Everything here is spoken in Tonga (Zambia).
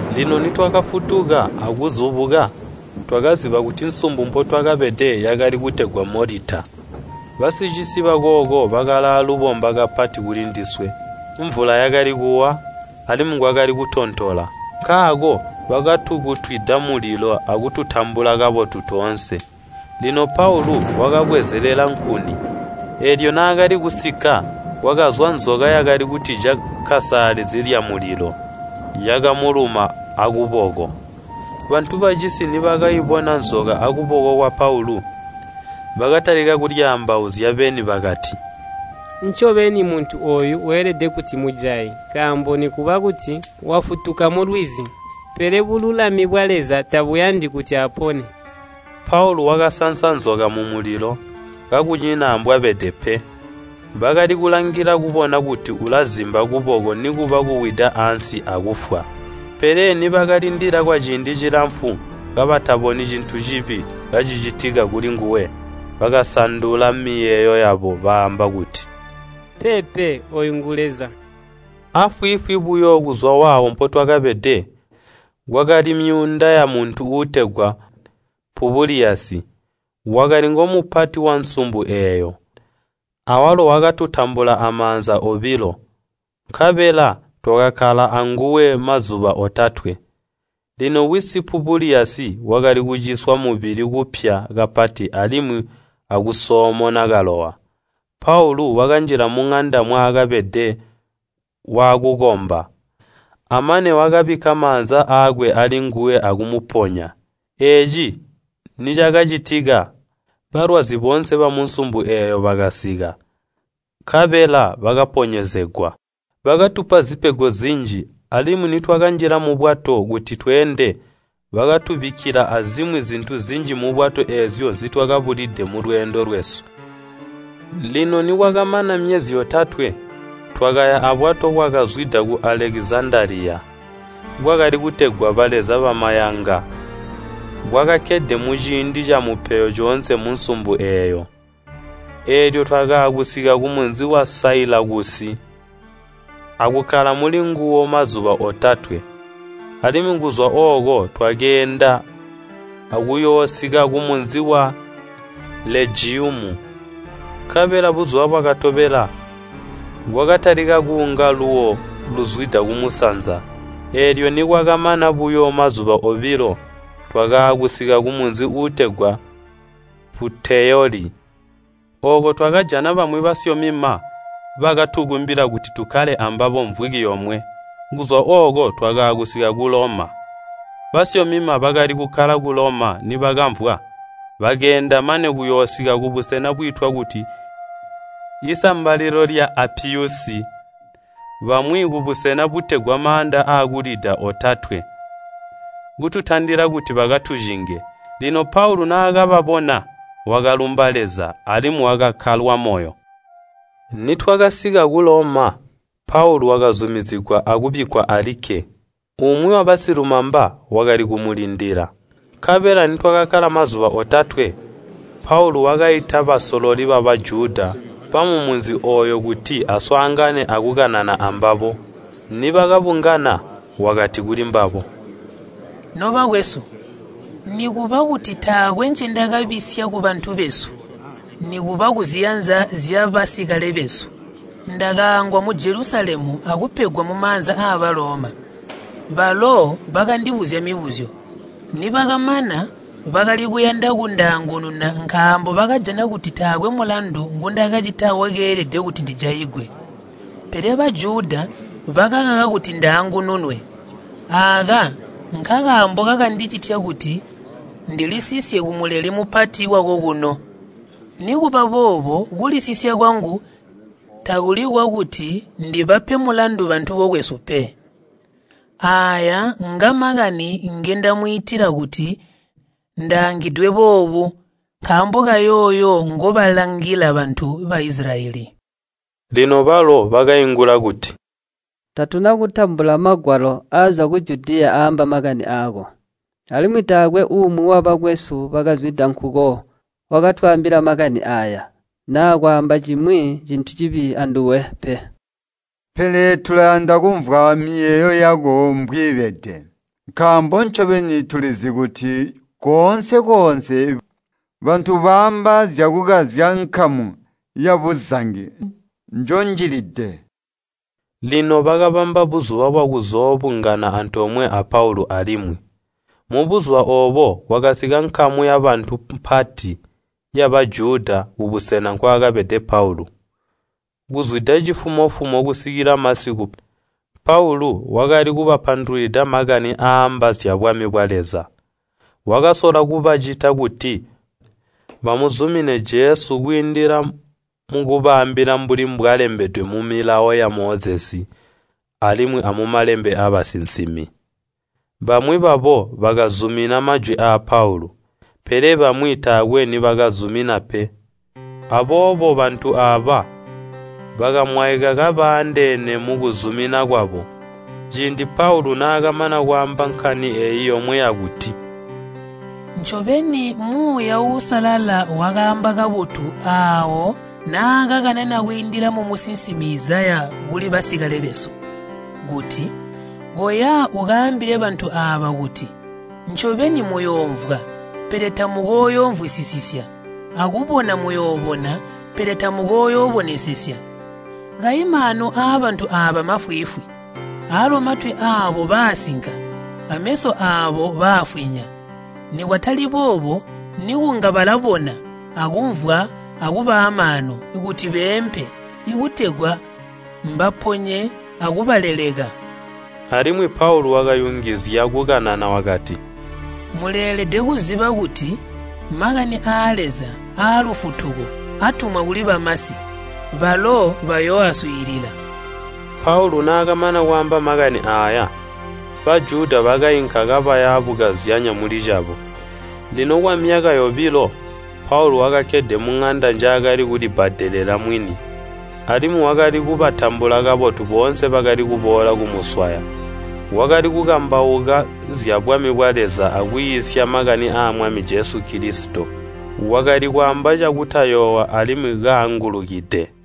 Lino nitwakafutuka akuzubuka, twakaziba kuti nsumbu mpotwakabede yakali kutegwa Molita. Basicisi bakooko bakalaalubomba kapati kulindiswe. Mvula yakali kuwa, alimwi kwakali kutontola, nkaako bakatukutwida mulilo akututambula kabotu toonse. Lino Paulu wakabwezelela nkuni, eelyo naakali kusikka, kwakazwa nzoka yakali kutija kkasaalizi lyamulilo, yakamuluma akuboko. Bantu bacisi nibakaibona nzoka akuboko kwa Paulu, bakatalika kulyaambauzya beni bakati, “Ncobeni muntu ooyu weelede kuti mujayi, nkaambo nikuba kuti wafutuka mulwizi, pele bululami bwa Leza tabuyandi kuti apone.” Paulu wakansansa nzoka mumulilo, kakunyina ambwabede pe. Bakali kulangilila kubona kuti ulazimba kuboko nikuba kuwida ansi akufwa. Pele nibakalindila kwaciindi cilamfu kabataboni cintu cibi kacicitika kulinguwe, bakasandula miyeeyo yabo baamba kuti, “Peepe! Ooyu nguleza!” Afwiifwi buyo kuzwa waawo mpotwakabede kwakali myuunda yamuntu uutegwa Pubuliyasi, wakali ngomupati wansumbu eeyo. Awalo wakatutambula amaanza obilo, nkabela twakakkala anguwe mazuba otatwe. Lino wisi Pubuliyasi wakali kuciswa mubili kuupya kapati alimwi akusoomona kalowa. Paulu wakanjila muŋanda mwaakabede, waakukomba, amane wakabikka maanza aakwe alinguwe akumuponya. Eeci nicakacitika, balwazi boonse bamunsumbu eeyo bakasika, nkabela bakaponyezegwa. Bakatupa zipego zinji, alimwi nitwakanjila mubwato kuti tweende bakatubikkila azimwi zintu zinji mubwato eezyo nzitwakabulide mulweendo lwesu. Lino nikwakamana myezi yotatwe, twakaya abwato bwakazwida ku Alekizandaliya bwakali kutegwa “baleza bamayanga” bwakakkede muciindi camupeyo coonse munsumbu eeyo. Eelyo twakaakusika kumunzi wa Sailakusi akukkala mulinguwo mazuba otatwe. Alimwi kuzwa ooko twakeenda akuyoosika kumunzi wa Legiyumu. Nkabela buzuba bwakatobela kwakatalika kuunga luuwo luzwida kumusanza, eelyo nikwakamana buyo mazuba obilo twakaakusika kumunzi uutegwa Puteyoli. Ooko twakajana bamwi basyomima bakatukumbila kuti tukkale ambabo mvwiki yomwe. Kuzwa ooko twakaakusika ku Loma. Basyomima bakali kukkala ku Loma nibakamvwa, bakeenda mane kuyoosika kubusena bwiitwa kuti Isambalilo lya Apiyusi bamwi kubusena butegwa Maanda Aakulida Otatwe, kututandila kuti bakatucinge. Lino Paulu naakababona, wakalumba Leza, alimwi wakakkalwa moyo. Nitwakasika ku Loma, Paulu wakazumizigwa akubikkwa alikke, umwi wabasilumaba wakali kumulindila. Nkabela nikwakamana mazuba otatwe, Paulu wakaita basololi ba Bajuda bamumunzi ooyo kuti aswaangane akukanana ambabo. Nibakabungana wakati kulimbabo, “Nobakwesu! Nikuba kuti taakwe ncendakabisya kubantu besu, nikuba kuziyanza zyabasikale besu, ndakaangwa mu Jelusalemu akupegwa mumaanza aa Baloma. Balo bakandibuzya mibuzyo, nibakamana bakali kuyanda kundaangununa nkaambo bakajana kuti taakwe mulandu ngundakacita wakeelede kuti ndijaigwe. Pele Bajuda bakakaka kuti ndaangununwe, aaka nkakaambo kakandicitya kuti ndilisisye ku Muleli Mupati wakokuno. Nikubaboobo kulisisya kwangu takuli kwakuti ndibape mulandu bantu bokwesu pe. Aaya ngamakani ngendamwiitila kuti ndaangidwe boobu nkaambo kayooyo ngobalangila bantu ba Isilayeli.” Lino balo bakaingula kuti, “Tatuna kutambula magwalo aazwa ku Judiya aamba makani aako. Alimwi taakwe umwi wabakwesu wakazwida nkuko wakatwaambila makani aaya, naa kwaamba cimwi cintu cibi anduwe pe pele tulayanda kumvwa miyeeyo yako mbwiibede, nkaambo ncobeni tulizi kuti koonse-koonse bantu baamba zyakukazya nkamu yabuzangi njonjilide.” Lino bakabamba buzuba bwakuzoobungana antoomwe a Paulu alimwi, mubuzuba oobo kwakasika nkamu yabantu mpati ya Bajuda kubusena kwakabede Paulu. Kuzwida cifumo-fumo kusikila masiku Paulu wakali kubapandulwida makani aaamba zyabwami bwa Leza. Wakasola kubacita kuti bamuzumine Jesu kwiindila mukubaambila mbuli mbwalembedwe mu Milawo ya Mozesi alimwi amumalembe aabasinsimi. Bamwi babo bakazumina majwi aa Paulu, pele bamwi taakwe nibakazumina pe. Aboobo bantu aaba bakamwaika kabaandeene mukuzumina kwabo, ciindi Paulu naakamana kwaamba nkani eeyi yomwe yakuti, “Ncobeni Muuya Uusalala wakaamba kabotu aawo naakakanana kwiindila mumusinsimi Izaya kuli basikale besu kuti, ‘Koya ukaambile bantu aaba kuti, Ncobeni muyoomvwa, pele tamukooyoomvwisisya akubona muyoobona pele tamukooyoobonesesya. Kayi maanu aabantu aaba mafwiifwi, aalo matwi aabo baasinka ameso aabo baafwinya. Nikwatali boobo nikunga balabona akumvwa akuba aamaanu kuti beempe kutegwa mbaponye akubaleleka.’” Alimwi Paulu wakayungizya kukukanana wakati, “Muleelede kuziba kuti makani aa Leza aalufutuko atumwa kuli bamasi. Balo bayooaswiilila!” [ Paulo naakamana kwaamba makani aaya, Bajuda bakainka kabaya bukazyanya mulicabo.] Lino kwamyaka yobilo Paulu wakakkede muŋanda njaakali kulibbadelela mwini, alimwi wakali kubatambula kabotu boonse bakali kuboola kumuswaya. Wakali kukambauka zyabwami bwa Leza akwiisya makani aa Mwami Jesu Kilisito. Wakali kwaamba cakutayoowa alimwi kaangulukide.